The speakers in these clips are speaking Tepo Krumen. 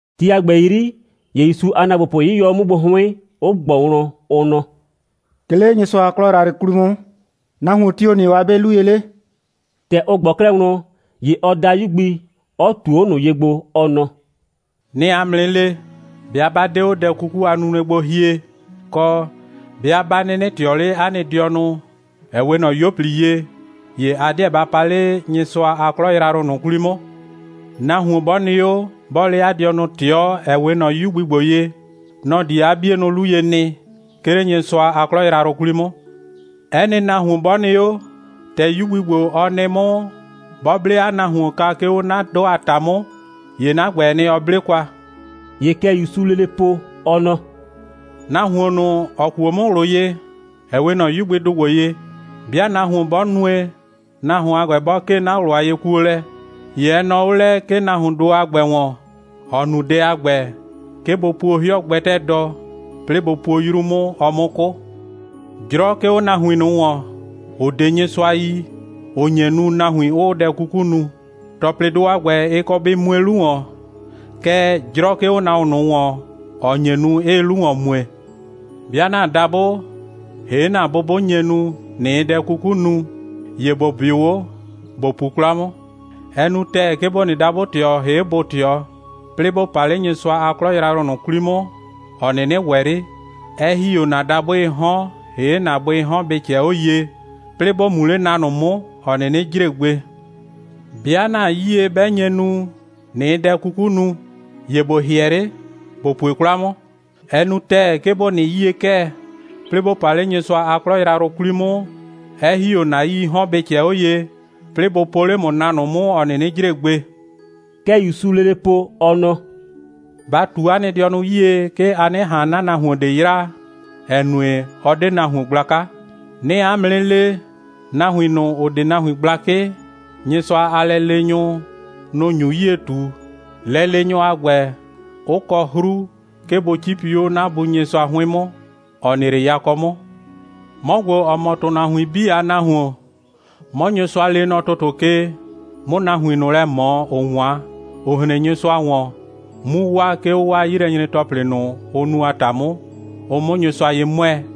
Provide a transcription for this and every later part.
Ti a ‑gbɛ 'yri, ‑ye ‑Yusu a ‑naagbopʋ 'yɩyɔ 'o 'mʋ gbo 'hʋɩn, 'ʋ ꞊gbɔ wlɔn, ʋ nɔ: «'Ke 'le Nyɩsʋa a 'klɔ yrayrʋ 'kwli 'mʋ, nahuon tio‑ nɩ 'o 'a 'be 'lu ye 'le?» ‑Tɛ ʋ ꞊gbɔ 'klɛɛ wlɔn, ‑ye ɔ da 'yu gbi, 'ɔ ꞊tuo 'o ꞊nʋ ye gbo, ɔ nɔ: «'Nɩɩ 'a mʋ 'nɩ le, 'bɩa 'ba 'de 'o dɛ 'kuku a nunue gbo hie, kɔ, 'bɩa 'ba 'nɩnɩ ꞊tɩɔ 'le 'a nɩ dɩɔnʋ, ‑ɛ 'we ꞊nɔ 'yuo꞊pli ye, ‑ye a 'deɛ ba pa 'le Nyɩsʋa a 'klɔ yrayrʋ ꞊nʋ 'kwli 'mʋ. Nahuon 'bɔ nɩ 'o, 'bɔɔ 'le 'a dɩɔnʋ ꞊tɩɔ, ‑ɛ 'we ꞊nɔ 'yu gbi ‑gbo ye, nɔ‑ di 'a 'bienʋ 'lu ye nɩ, 'ke 'le Nyɩsʋa a 'klɔ yrayrʋ 'kwli 'mʋ. 'Ɛ nɩ nahuon 'bɔ nɩ 'o, ‑tɛ 'yu gbi ‑gbo, ɔ nɩ 'mʋ, 'bɔ 'ble 'a nahuon kwa, 'ke 'o 'na 'dʋ a ‑ta 'mʋ, ‑ye 'na ‑gbɛɛ nɩ, ɔ 'ble kwa.» ‑Ye kɛ ‑Yusuu lele po, ɔ nɔ: «Nahuon ꞊nʋ, ‑ɔ kuo 'mʋ ꞊wlʋ ye, ‑ɛ 'we ꞊nɔ 'yu gbidʋ ‑gbo ye, 'bɩa nahuon 'bɔ nue, nahuon a ‑gbɛ bɔ 'kee 'na ꞊wlʋ a yekuolɛ, ‑ye ɛ nɔɔ 'o lɛ, 'ke 'o nahuondʋ a ‑gbɛ ‑wɔn, ‑ɔ nu dɛ a ‑gbɛ, 'ke bʋ puo 'hɩɔ gbɛtɛɛ dɔ, 'plɩɩ bʋ puo 'yru 'mʋ, ɔ 'mʋ 'kʋ. 'Jrɔ 'ke 'o nahuin ꞊nʋ ‑wɔn, ‑ʋ 'de Nyɩsʋa yi, ‑ʋ nye nu, nahuin 'ʋʋ dɛ 'kuku nu. ‑Tɔplɩdʋ a ‑gbɛ, ɩ kɔ bɩ mue 'lu ‑wɔn. Kɛɛ, 'jrɔ 'ke 'o nahuon ꞊nʋ ‑wɔn, ‑ɔ nye nu, 'ɩɩ 'lu ‑wɔn mue. 'Bɩa ‑na dabʋ ‑hee' ‑na bʋ 'bʋ nye nu, ꞊nɩɩ dɛ 'kuku nu, ‑ye ‑bo 'bɩʋ 'o, ‑bo pu 'kwla 'mʋ. Ɛ nu ‑tɛɛ, 'ke ‑bo nɩ dabʋ‑tɩɔ, ‑hee' bʋ‑tɩɔ, 'plɩɩ ‑bo pa 'le Nyɩsʋa a 'klɔ yrayrʋ ꞊nʋ 'kwli 'mʋ, ‑ɔ 'nɩnɩ ‑wɛ 'le, 'ɛ ‑hi 'o ‑na dabʋɩɩ 'hɔn ‑hee' ‑na bʋɩɩ 'hɔn bɩ ꞊cɛɛ 'o ye, 'plɩɩ ‑bo mu 'le na ꞊nʋ 'mʋ, ‑ɔ 'nɩnɩ jre gbe. 'Bɩa ‑na 'yie 'bɛ nye nu, ꞊nɩɩ dɛ 'kuku nu, ‑ye ‑bo ‑hɩɛ 'le, ‑bo pue 'kwla 'mʋ. Ɛ nu ‑tɛɛ, 'ke ‑bo nɩ 'yie'kɛɛ, 'plɩɩ ‑bo pa 'le Nyɩsʋa a 'klɔ yrayrʋ 'kwli 'mʋ, 'ɛ ‑hi 'o ‑na 'yii 'hɔn bɩ ꞊cɛɛ 'o ye, 'plɩɩ bʋ po 'le ‑mʋ na ꞊nʋ 'mʋ, ‑ɔ 'nɩnɩ jre gbe.» Kɛ ‑Yusuu lele po, ɔ nɔ: «Ba ꞊tu 'a nɩ dɩɔnʋ 'yie, 'ke a 'nɩ ꞊han 'na nahuon ꞊de yraa, ‑ɛ nue, ɔ 'de nahuon gblaka. 'Nɩɩ 'a mʋ 'nɩ le, nahuin ꞊nʋ, ‑ʋ 'de nahuin gblakɩ, Nyɩsʋa a lɛleenyʋ, nʋ‑ nyu 'yie ꞊tu, lɛleenyʋ a ‑gbɛ, 'ʋ kɔ 'hru, 'ke bʋ 'cipi 'o 'na Bu Nyɩsʋa 'hʋɩn 'mʋ, ‑ɔ nɩ 'le yakɔ 'mʋ. [ 'Mɔ ‑gbo, ‑ɔ mɔ ‑tʋnahuin 'bii a Nahuon, 'mɔ Nyɩsʋa lee nɔ ‑tʋtʋ ke, 'mʋ nahuin ꞊nʋ lɛ ꞊mɔ, ‑ʋ 'wan, ‑ʋ hren Nyɩsʋa ‑wɔn, 'mu waa, 'ke 'o 'waa 'yilɛnyre‑tɔplɩ ꞊nʋ, ʋ nu a ‑ta 'mʋ, ʋ 'mʋ Nyɩsʋa ye 'mʋɛɛ.]»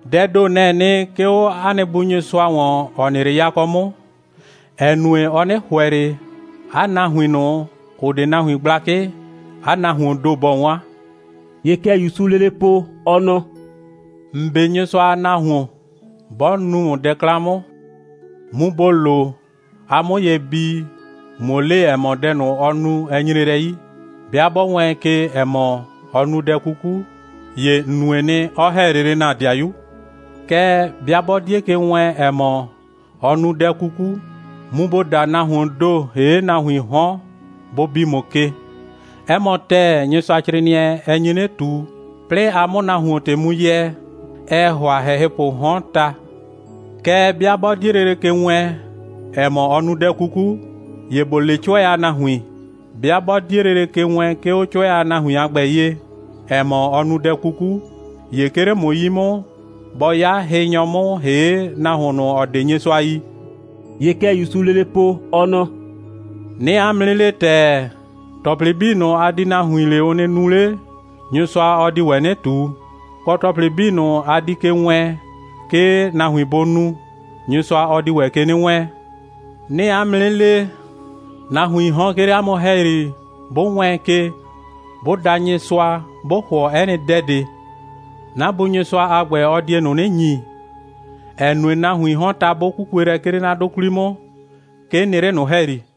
Dɛɛ ‑do, nɛ‑ɛ nɩ, 'ke 'o 'a nɩ Bu Nyɩsʋa ‑wɔn, ‑ɔ nɩ 'le yakɔ 'mʋ, ‑ɛ nue, ɔ 'nɩ ‑hʋɛ ꞊le, 'a nahuin ꞊nʋ, ‑ʋ 'de nahuin gblakɩ, 'a nahuoon ‑do bɔ 'wan.» (‑Ye kɛ ‑Yusuu lele po, ɔ nɔ:) «‑N 'be Nyɩsʋa a nahuon 'bɔ nu ‑mʋ dɛ 'klan 'mʋ, mu ‑bo lo, a 'mʋ ye bii, ꞊muo le, ‑ɛ mɔ, dɛ ꞊nʋ, ɔ nu, ɛ nyre lɛ 'yi. 'Bɩa 'bɔ wɛɛn ke, ‑ɛ mɔ, ɔ nu dɛ 'kuku, ‑ye ‑n nue nɩ, 'ɔ ‑hɛ lele ‑na 'dɩayu. Kɛɛ, 'bɩa 'bɔ 'die ke wɛɛn, ‑ɛ mɔ, ɔ nu dɛ 'kuku, mu ‑bo da nahuoon ‑do, ‑hee' nahuiin 'hɔn, bʋ bi ‑mʋ ke. 'Ɛ mɔ ‑tɛɛ, Nyɩsʋacrɩɩnɩɛ, ɛ nyi 'nɩ ꞊tu, 'plɩɩ a 'mʋ nahuon ‑tɩ mu yɛɛ, ɛɛ ‑hʋa ‑hɛhɩpʋʋ 'hɔn, ta. Kɛɛ, 'bɩa 'bɔ 'die lele ke wɛɛn, ‑ɛ mɔ, ɔ nu dɛ 'kuku, ‑ye ‑bo le 'cʋɛ a nahuin. 'Bɩa 'bɔ 'die lele ke wɛɛn, 'ke 'o 'cʋɛ a nahuin a ‑gbɛ ye, ‑ɛ mɔ, ɔ nu dɛ 'kuku, ‑ye 'ke 'le ‑mʋ 'yi 'mʋ, bɔ 'ya hɩnyɔ 'mʋ, ‑hee' nahuon ꞊nʋ, ‑ɔ 'de Nyɩsʋa yi.» (‑Ye kɛ ‑Yusuu lele po, ɔ nɔ:) «'Nɩɩ 'a mʋ 'nɩ le ‑tɛɛ, ‑tɔplɩ 'bii ꞊nʋ, a di nahuin le, ʋ nɩ nu 'le, Nyɩsʋa, ɔ di ‑wɛ 'nɩ ꞊tu. Kɔ, ‑tɔplɩ 'bii ꞊nʋ, a di ke wɛɛn, 'ke nahuin bʋ nu, Nyɩsʋa, ɔ di ‑wɛ ke 'nɩ wɛɛn. 'Nɩɩ 'a mʋ 'nɩ le, nahuiin 'hɔn, 'ke 'le 'a mʋ ‑hɛyri, 'bʋ wɛɛn ke, 'bʋ da Nyɩsʋa, 'bʋ ‑hʋɔ 'ɛ nɩ dɛ ꞊de, 'na Bu Nyɩsʋa a ‑gbɛ, ɔ die ꞊nʋ 'nɩ ‑nyi, ‑ɛ nue, nahuiin 'hɔn, ta, 'bʋ 'kukue lɛ, 'ke 'le 'na 'dʋ 'kwli 'mʋ, 'ke 'n nɩ 'le ꞊nʋ ‑hɛyri.»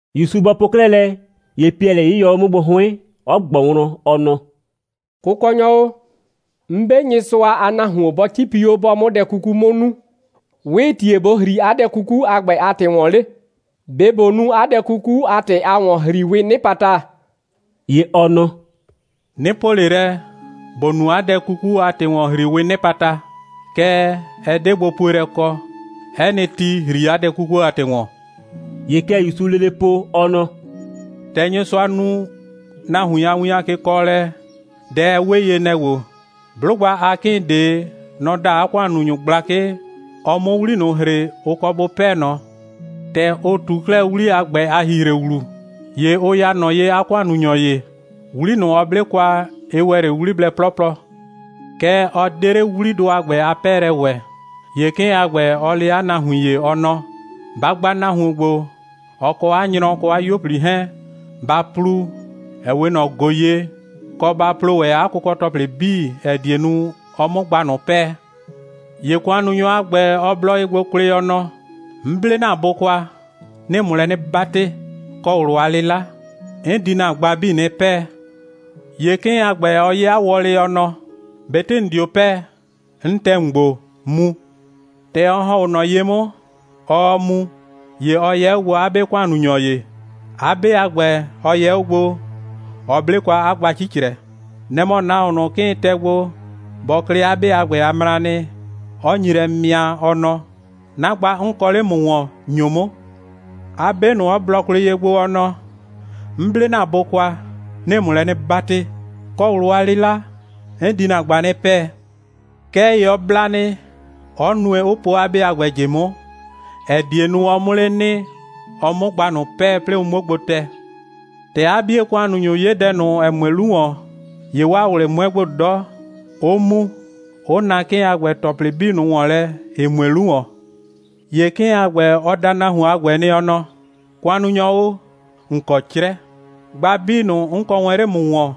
‑Yusu bɔ po 'klɛɛ lɛ, ‑ye Piɛlɩ 'yɩyɔ 'o 'mʋ gbo 'hʋɩn, 'ɔ ꞊gbɔ wlɔn, ɔ nɔ: «Kʋkɔnyɔ o, 'n 'be Nyɩsʋa a nahuon, 'bɔ 'cipi 'o, 'bɔɔ 'mʋ dɛ 'kuku 'mʋ nu, 'wɩɩ ‑tie ꞊bo ‑hri 'a dɛ 'kuku a ‑gbɛ a ‑tɩ ‑wɔn 'le? ꞊Be ꞊bo nu 'a dɛ 'kuku a ‑tɩ a ‑wɔn‑hriiwɩɩ 'nɩpata?» ‑Ye ɔ nɔ: «'Nɩ po ꞊le lɛ, ‑bo nu 'a dɛ 'kuku a ‑tɩ a ‑wɔn‑hriiwɩɩ 'nɩpata, kɛɛ, ɛ 'de gbopuelɛ kɔ. 'Ɛ nɩ ti, ‑hri 'a dɛ 'kuku a ‑tɩ ‑wɔn.» ‑Ye kɛ ‑Yusuu lele po, ɔ nɔ: «‑Tɛ Nyɩsʋa nu nahuin a win a kekɔɔlɛ, dɛ, ɛ 'we ye, nɛ‑ ‑gbo: 'Blʋgba a 'kɩɩn ꞊de, nɔ‑ da 'a ‑kʋannunyʋ gblakɩ, ɔ 'mʋ 'wli ꞊nʋ ‑hre, ʋ kɔ bʋ 'pɛɛ ꞊nɔ. ‑Tɛ ɔ ꞊tu 'klɛɛ 'wli a ‑gbɛ a ‑hihre ‑wlu, ‑ye ʋ ya ꞊nɔ ye 'a ‑kʋannunyɔ ‑ye. 'Wli ꞊nʋ, ɔ 'ble kwa, ɩ ‑wɛ 'le 'wliblɛ 'plɔplɔ. Kɛɛ, ɔ 'de 'le 'wlidʋ a ‑gbɛ a 'pɛɛlɛ ‑wɛ. ‑Ye 'kɩɩn a ‑gbɛ, ɔ le 'a nahuin ‑ye, ɔ nɔ: Ba gba nahuon ‑gbo, ɔ kɔ 'a nyrɔ, kɔ 'a 'yuo꞊pli 'hɛɛn, ba plu, ‑ɛ 'we ꞊nɔ ꞊go ye, kɔ, ba plo ‑wɛ 'a kʋkɔ‑tɔplɩ 'bii, ‑ɛ die nu, ɔ 'mʋ gba ꞊nʋ 'pɛɛ. ‑Ye ‑kʋannunyɔ a ‑gbɛ, ɔ blɔ ye gbo kwlɩ, ɔ nɔ: 'N 'ble ‑na bʋ kwa, 'nɩɩ ‑mʋ lɛ 'nɩ 'batɩ, kɔ ꞊wlʋ a 'lɩla. 'N di ‑na gba 'bii 'nɩ 'pɛɛ. ‑Ye 'kɩɩn a ‑gbɛ, ɔ 'ye 'a wɔlɩ, ɔ nɔ: ꞊Betɩ ‑n 'dio 'pɛɛ, 'n tɛ ‑mʋ gbo, mu. ‑Tɛ ɔ ‑hɔn 'o ꞊nɔ ye 'mʋ, ɔɔ mu, ‑ye ɔ yɛ 'o gbo 'a 'be ‑kʋannunyɔ ‑ye. 'A 'be a ‑gbɛ, ɔ yɛ 'o gbo, ɔ 'ble kwa 'a gba 'cicrɛ. Nɛ‑ mɔ, nahuon ꞊nʋ, 'kɩɩn tɛ gbo, bɔ klɩ 'a 'be a ‑gbɛ a mranɩ, 'ɔ nyi lɛ mɩa, ɔ nɔ: 'Na gba, 'n kɔ 'le ‑mʋ ‑wɔn, ‑nyo 'mʋ! 'a 'be ꞊nʋ, 'ɔ blɔ kwlɩ ye gbo, ɔ nɔ: 'N 'ble ‑na bʋ kwa, 'nɩɩ ‑mʋ lɛ 'nɩ 'batɩ, kɔ ꞊wlʋ a 'lɩla. 'N di ‑na gba 'nɩ 'pɛɛ. Kɛɛ ‑ye ɔ bla nɩ, 'ɔ nue, 'ʋ po 'a 'be a ‑gbɛ ꞊jɩ 'mʋ, ‑ɛ die nu, ɔ 'mʋ 'le nɩ, ɔ 'mʋ 'a gba ꞊nʋ 'pɛɛ, 'plɩɩ ʋ 'muo gbo tɛ. ‑Tɛ 'a 'bie ‑kʋannunyʋ ‑ye 'ye dɛ ꞊nʋ, ‑ɛ mue 'lu ‑wɔn, ‑ye 'waa ꞊wlɩ 'mʋɛ gbo 'dɔ, 'ʋ mu, 'ʋ na 'kɩɩn a ‑gbɛ ‑tɔplɩ 'bii ꞊nʋ ‑wɔn lɛ, ‑ɩ mue 'lu ‑wɔn. ‑Ye 'kɩɩn a ‑gbɛ, ɔ da nahuon a ‑gbɛ nɩ, ɔ nɔ: ‑Kʋannunyɔ o, ‑n kɔ 'crɛ, gba 'bii ꞊nʋ, 'n kɔ wɛn 'le ‑mʋ ‑wɔn,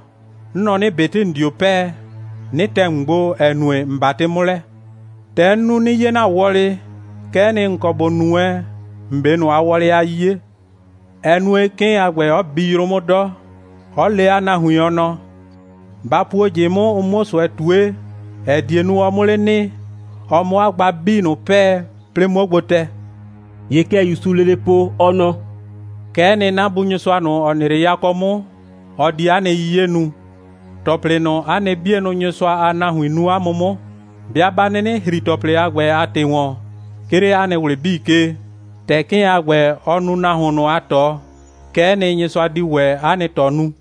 'n nɔ 'nɩ, ꞊betɩ ‑n 'dio 'pɛɛ, 'nɩ tɛ ‑mʋ gbo, ‑ɛ nue, ‑n 'batɩ 'mʋ lɛ. ‑Tɛ 'n nu, 'nɩ 'ye ‑na wɔlɩ, kɛ'ɛ nɩ, ‑n kɔ ‑bo nu wɛn ‑n 'be ꞊nʋ a wɔlɩ a 'yiye. Ɛ nue, 'kɩɩn a ‑gbɛ 'ɔ bi yrʋ 'mʋ 'dɔ, 'ɔ le 'a nahuin, ɔ nɔ: Ba puo ꞊jɩ 'mʋ, ʋ 'muo ꞊sʋɛ ꞊tue, ‑ɛ die nu, ɔ 'mʋ 'le nɩ, ɔ 'mʋ 'a gba 'bii ꞊nʋ 'pɛɛ, 'plɩɩ 'muo gbo tɛ.» ‑Ye kɛ ‑Yusuu lele po, ɔ nɔ: «Kɛ'ɛ nɩ, 'na Bu ꞊nʋ, ‑ɔ nɩ 'le yakɔ 'mʋ, ɔ di 'a nɩ 'yiye nu. ‑Tɔplɩ ꞊nʋ, 'a nɩ 'bienʋ Nyɩsʋa a nahuin nu 'a mʋ 'mʋ, 'bɩa 'ba 'nɩnɩ ‑hri ‑tɔplɩ a ‑gbɛ a ‑tɩ ‑wɔn, 'ke 'le 'a nɩ ꞊wlɩ 'bii ke, ‑tɛ 'kɩɩn a ‑gbɛ, ɔ nu nahuon ꞊nʋ a ꞊tɔ, kɛ'ɛ nɩ, Nyɩsʋa di ‑wɛ 'a nɩ ꞊tɔ nu.»